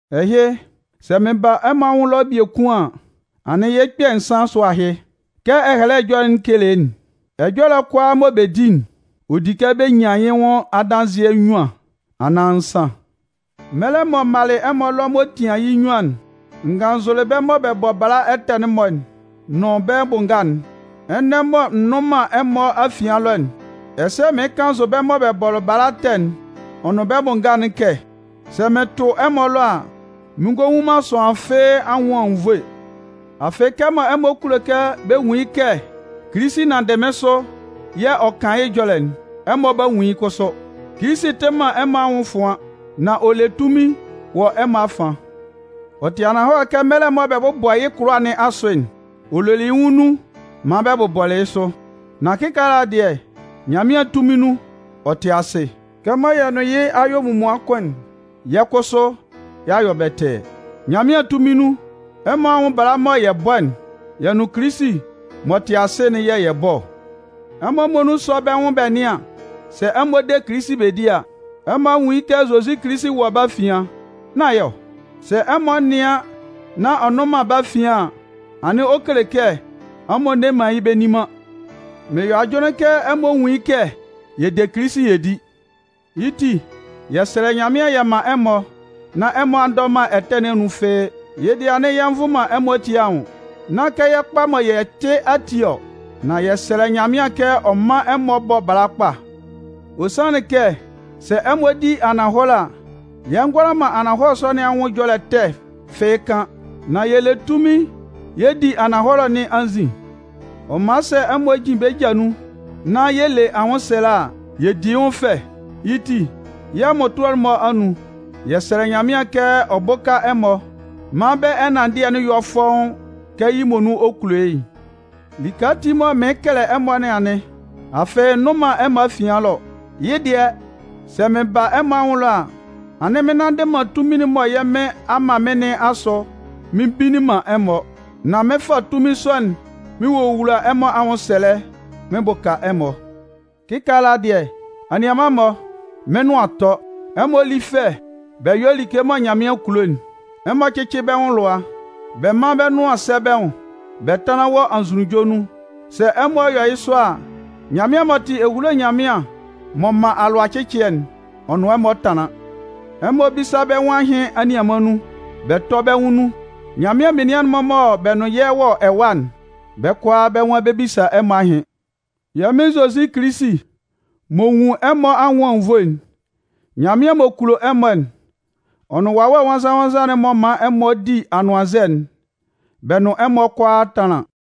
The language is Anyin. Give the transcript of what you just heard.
Ɛhɩ, sɛ mɩn ba ɛmɔ anwʋn ɛlɔ biekun an, anɩn yɩ́ kpɛ̂ nsan asʋ ahɩ. Kɛ Ɛhɛlɛ Ɛjɔlɛ'n kele'n: Ɛjɔlɛ kʋalaa mɔ bɛ 'di'n, ɔ di kɛ bɛ nyan yɩ́ nwʋn adanzɩɛ nnyuan anaan nsan. Mɛlɛ mɔ m malɩ ɛmɔ ɛlɔ m'ɔ tian yɩ́ nnyuan'n, n gannzʋlɩ bɛ́ mɔ bɛ bɔ bala ɛtɛ'n-mɔ nʋn bɛ́ bʋ nga'n. Ɛnɛ mɔ n nnʋn ɛmɔ afian ɛlɔ'n, ɛsɛ mɩɩn kannzʋ bɛ́ mɔ bɛ bɔlɩ bala ɛtɛ'n ɔ nʋn bɛ́ bʋ nga'n kɛ, sɛ mɩn tʋ ɛmɔ ɛlɔ a, mɩn ngɔ nwun man sʋanlan fɩ́ɩ́ anwʋn anwunnvoe. Afɩ, kɛmɔ ɛmɔ kulo kɛ bɛ nwun yɩ́ kɛ Kilisi nanndɩ mɩ́n sʋ yɛ̂ ɔ kan yɩ́ ɛjɔlɛ'n, ɛmɔ 'ba nwun yɩ́ kʋsʋ. Kilisi tɩ man ɛmɔ anwʋn ɛfʋan, nan ɔ le tunmin wɔ ɛmɔ afian. Ɔ tɩ ananhɔlɛ kɛ mɛlɛ mɔ bɛ 'bʋbɔ yɩ́ kʋlʋwa nɩn asʋ'n, ɔ lolɩ yɩ́ nwʋn nun maan bɛ bʋbɔ yɩ́ sʋ. Nan kɩkaala dɩɛ, Nyanmɩan tunmin nun, ɔ tɩ asɩ. Kɛmɔ yɛ nʋn yɩ́ a yɔ munmuan kʋn'n, yɛ́ kʋsʋ y'a yɔ bɛtɛɛ. Nyanmɩan tunmin nun, ɛmɔ anwʋn bala'n mɔ yɛ bɔ'n, yɛ nʋn Kilisi m'ɔ tɩ asɩ'n yɛ̂ yɛ bɔ ɔ. Ɛmɔ muonun sɔ́ bɛ́ nwʋn bɛ nɩ́an sɛ ɛmɔ de Kilisi bɛ di a. Ɛmɔ a nwun yɩ́ kɛ Zozi Kilisi wɔ bɛ́ afian, nán yɩ́ ɔ? Sɛ ɛmɔ nɩan nán ɔ nnʋn man bɛ́ afian an, anɩn ɔ kele kɛ ɛmɔ nne man yɩ́ bɛ nni man. Mɩn yɔ ajʋnlɩn kɛ ɛmɔ nwun yɩ́ kɛ yɛ de Kilisi yɛ di. Yɩ́ ti, yɛ sɛlɛ Nyanmɩan yɛ man ɛmɔ nán ɛmɔ a ndɔ man ɛtɛ nɩn anun fɩ́ɩ́, yɩ́ dɩɛ anɩn yɛ nvʋ man ɛmɔ ati anwʋn. Nán kɛ yɛ́ kpa mɔ yɛ tɩ ati ɔ. Nan yɛ sɛlɛ Nyanmɩan kɛ ɔ mán ɛmɔ bɔ́ bala kpa. Ɔ sanlɩn kɛ sɛ ɛmɔ di ananhɔlɛ a, yɛ ngʋala man ananhɔlɛ sɔ nɩn anwʋn ɛjɔlɛ ɛtɛ fɩ́ɩ́ kan. Nan yɛ le tunmin yɛ di ananhɔlɛ nɩn anzin. Ɔ man sɛ ɛmɔ jin bɛ́ ja nun, nán yɛ le man anwʋnsɛlɛ a, yɛ di yɩ́ nwʋn fɛ. Yɩ́ ti, yɛ́ mmʋtʋɛ'n-mɔ anun, yɛ sɛlɛ Nyanmɩan kɛ ɔ bʋ́ka ɛmɔ maan bɛ́ ɛnanndɩɛ'n yɔ́ fɔ́ʋ́n kɛ yɩ́ muonun ɔ kulo yɩ́'n. Like ati mɔ mɩɩn kɛlɛ ɛmɔ nɩn anɩn, afɩ n nnʋn man ɛmɔ afian ɛlɔ. Yɩ́ dɩɛ, sɛ mɩn ba ɛmɔ anwʋn ɛlɔ a, anɩn mɩn nnanndɩ man tunmin'n mɔ yɛ́ Mɩn a man mɩ́n nɩn asʋ mɩn mbinnin man ɛmɔ. Nan mɩn fa tunmin sɔ'n mɩn wowula ɛmɔ anwʋnsɛlɛ mɩn bʋka ɛmɔ. Kikaala dɩɛ, anianman-mɔ, mɩ́n nʋan a tɔ. Ɛmɔ lí fɛ, bɛ yɔ́ like mɔ Nyanmɩan kulo'n. Ɛmɔ cɩ́cɩ bɛ́ nwʋn lʋa. Bɛ mán bɛ́ nʋan sɛ́ bɛ́ nwʋn, bɛ tánlan wɔ anzʋnunjɔ nun. Sɛ ɛmɔ yɔ yɩ́ sɔ a, Nyanmɩan m'ɔ tɩ ehulo Nyanmɩan m'ɔ man alʋacɩcɩɛ'n, ɔ nʋn ɛmɔ 'tanlan. Ɛmɔ bísa bɛ́ nwʋn ahɩn anianman nun, bɛ tɔ́ bɛ́ nwʋn nun. Nyanmɩan menian'n-mɔ mɔ bɛ nʋn yɛ́ wɔ ɛwa'n, bɛ́ kʋalaa bɛ́ nwan bɛ 'bisa ɛmɔ ahɩn. Yɛ́ Mɩn Zozi Kilisi m'ɔ nwun ɛmɔ anwʋn anwunnvoe'n, Nyanmɩan m'ɔ kulo ɛmɔ'n, ɔ nʋn Wawɛ Nwannzan-nwannzan'n m'ɔ man ɛmɔ di anʋannzɛ'n, bɛ nʋn ɛmɔ kʋalaa tánlan.